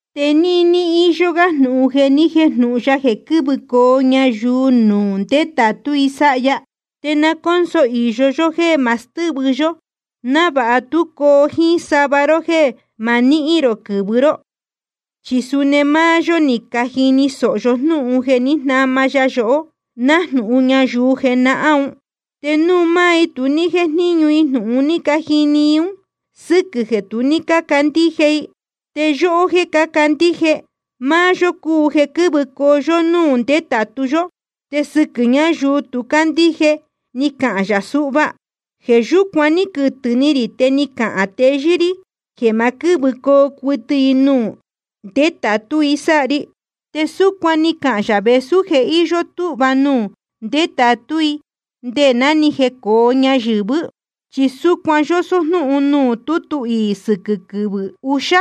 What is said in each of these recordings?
Te níní íyó gá jnūhun jeē ni jéjnūhun ya jeē quɨ́vɨcoo ñayuu nuū ndetātú i sáha ya, te na cónso īyo yó jéē ma stɨ́vɨ yó, návāha tú coo jíín sava ró jéē ma nihín rō quɨ̄vɨ ró. Chi suni máá yó ni cajini sōho yó jnúhun jeē jnáma ya yohó, nájnūhun ñayuu jenahán un. Te nuū maá i tu ní jéjníñu jnūhun ni cajini i ún, sɨquɨ̄ jeē tu ní cácandíje i. Te yóhó jéē cácandíje, máá yó cúu jeē quɨ́vɨcoo yó núū ndetātu yó. Te sɨquɨ̄ ñáyuu tu cácandíje ni cahān yā suhva: Jeē yúcuan ní quɨtɨ̄ ni rī, te ni cahān teyɨ́ rí jeē ma quɨ́vɨcoo cuɨtɨ i nuū ndetātú i sáha ri. Te súcuan ni cahān yā vēsú je íyó túhva nuū ndetātú i nde ná ni jecōo ñayɨ̄vɨ́. Chi súcuan yósó jnúhun nuū tútu iī sɨquɨ̄ quɨvɨ̄ uxá: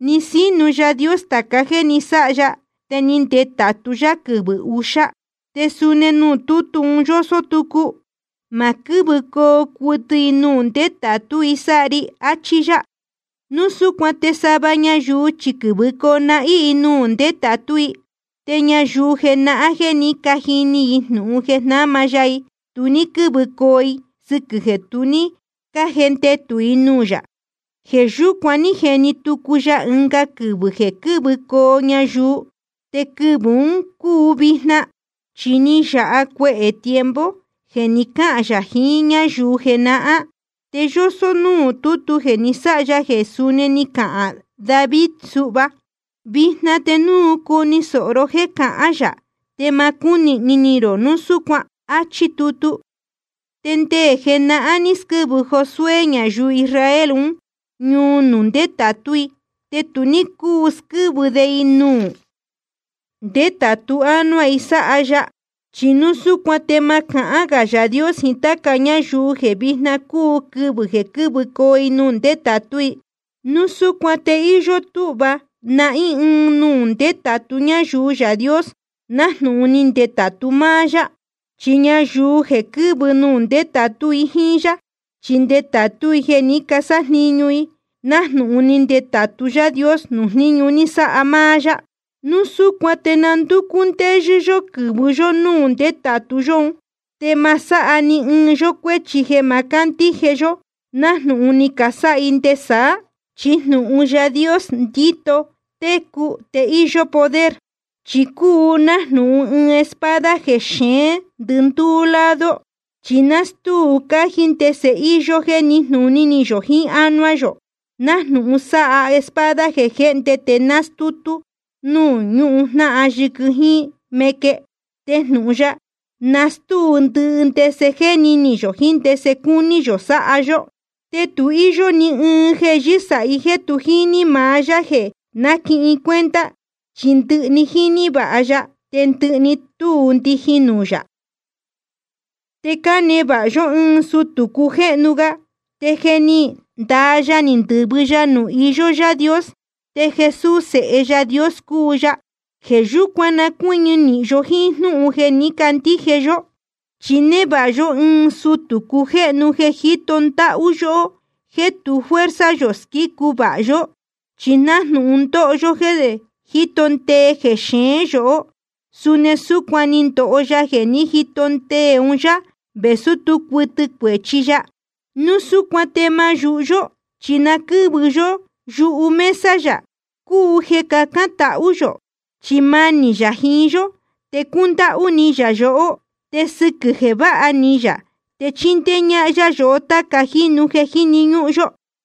Ni sínu Yaā Dios tāca jéē ni sáha ya, te ni ndetātu yá quɨvɨ̄ uxá. Te suni nuū tútu un yósó tucu: Ma quɨ́vɨcoo cuɨtɨ i nuū ndetātú i sáha ri. Achí yá. Núu súcuan te sava ñayuu chi quɨ̄vɨcoo nahín i nuū ndetātú i. Te ñayuu jenahán jéē ní cajini jnūhun jeē jnáma ya i, tu ní quɨ́vɨcoo i sɨquɨ̄ jeē tu ní cájendetū i nuū yā. Jeē yúcuan ní jeni tucu ya ɨnga quɨvɨ̄ jeē quɨ́vɨcoo ñayuu, te quɨvɨ̄ un cúu vijna. Chi ná ni yāha cuehē tiempo jeē ni cáhān yā jiín ñáyuu jenahán, te yósó núū tútu jeē ni sáha ya jeē suni ni cahān David suhva: Vijna te núu cuni sōho ró jéē cahán yā, te ma cúnīhni ni rō núu súcuan. Achí tutu. Te nde jenahán ní squɨ́vɨ Josué ñayuu Israel un ñuu nuū ndetātú i. Te tu ní cúu squɨ́vɨ de i nuū ndetātu ánuá i sáha ya. Chi núu súcuan te ma cahán gā Yaā Dios jiín táca ñáyuu jeē vijna cúu quɨvɨ̄ jeē quɨ́vɨcoo i nuū ndetātú i. Núu súcuan te íyó túhva nahín ɨɨn nuū ndetātu ñáyuu Yaā Dios, nájnūhun ni ndetātu máá yá. Chi ñayuu jeē quɨ́vɨcoo nuū ndétātú i jíín yá, chi ndétātú i jeē ní casájniñu i, nájnūhun ni ndetātú Yaā Dios nuū jníñu ni sáha máá yá. Núu súcuan te na ndúcú ndéyɨ́ yó quɨ̄vɨ yó núū ndetātu yó un, te ma sáha ni ɨɨn yó cuéchi jeē ma cándíje yó, nájnūhun ni casáha i nde saá. Chi jnūhun Yaā Dios ndíto técu te íyó poder. Chi cúu nájnūhun ɨɨn espada jeē xeén ndɨndúú lado, chi nástúu cájí ndese íyó jéē níjnūní yō jiín ánuá yō, nájnūhun sáha espada jeē jéhnde te nástúu nuū ñujnáhan yɨquɨ jíín meque. Te jnūhun ya nástúu ndɨhɨ ndese jéni ni yō jiín ndese cúní yō sáha yó. Te tu íyó ni ɨɨn jeē yɨ́sāhí jeē tu jíní maá Yaā jeē náquihin cuenta, chi ndɨhɨ‑ni jíní vāha ya, te ndɨhɨ‑ni túu ndijin nuū yā. Te cánevāha yó ɨɨn sutū cujéhnu ga, te je ni ndaa ya ni ndɨ̄vɨ ya nuū iyó Yaā Dios. Te Jesús Sēhe Yaā Dios cúu ya. Jeē yúcuan na cuɨ́ñɨ nīhin yó jíín jnúhun jeē ní candíje yó. Chi névāha yó ɨɨn sutū cujéhnu jeē jíto ndáhú yóhó jeē tu fuerza yō squícu vāha yó. Chi nájnūhun ndóho yó jéē jíto ndee jexeén yohó, suni súcuan ni ndoho ya jeē ní jito ndee un yá, vēsú tú cuɨtɨ cuēchi ya. Núu súcuan te ma yūhu yó, chi na quɨ́vɨ yó yuhu mesa yā, cúu jeē cacān tahú yō. Chi manī yā jiín yó, te cúndáhú ni yā yohó, te sɨquɨ̄ jeē váha ni yā te chíndéé ñáhán yá yohó táca jínu jeē jíni ñúhún yó.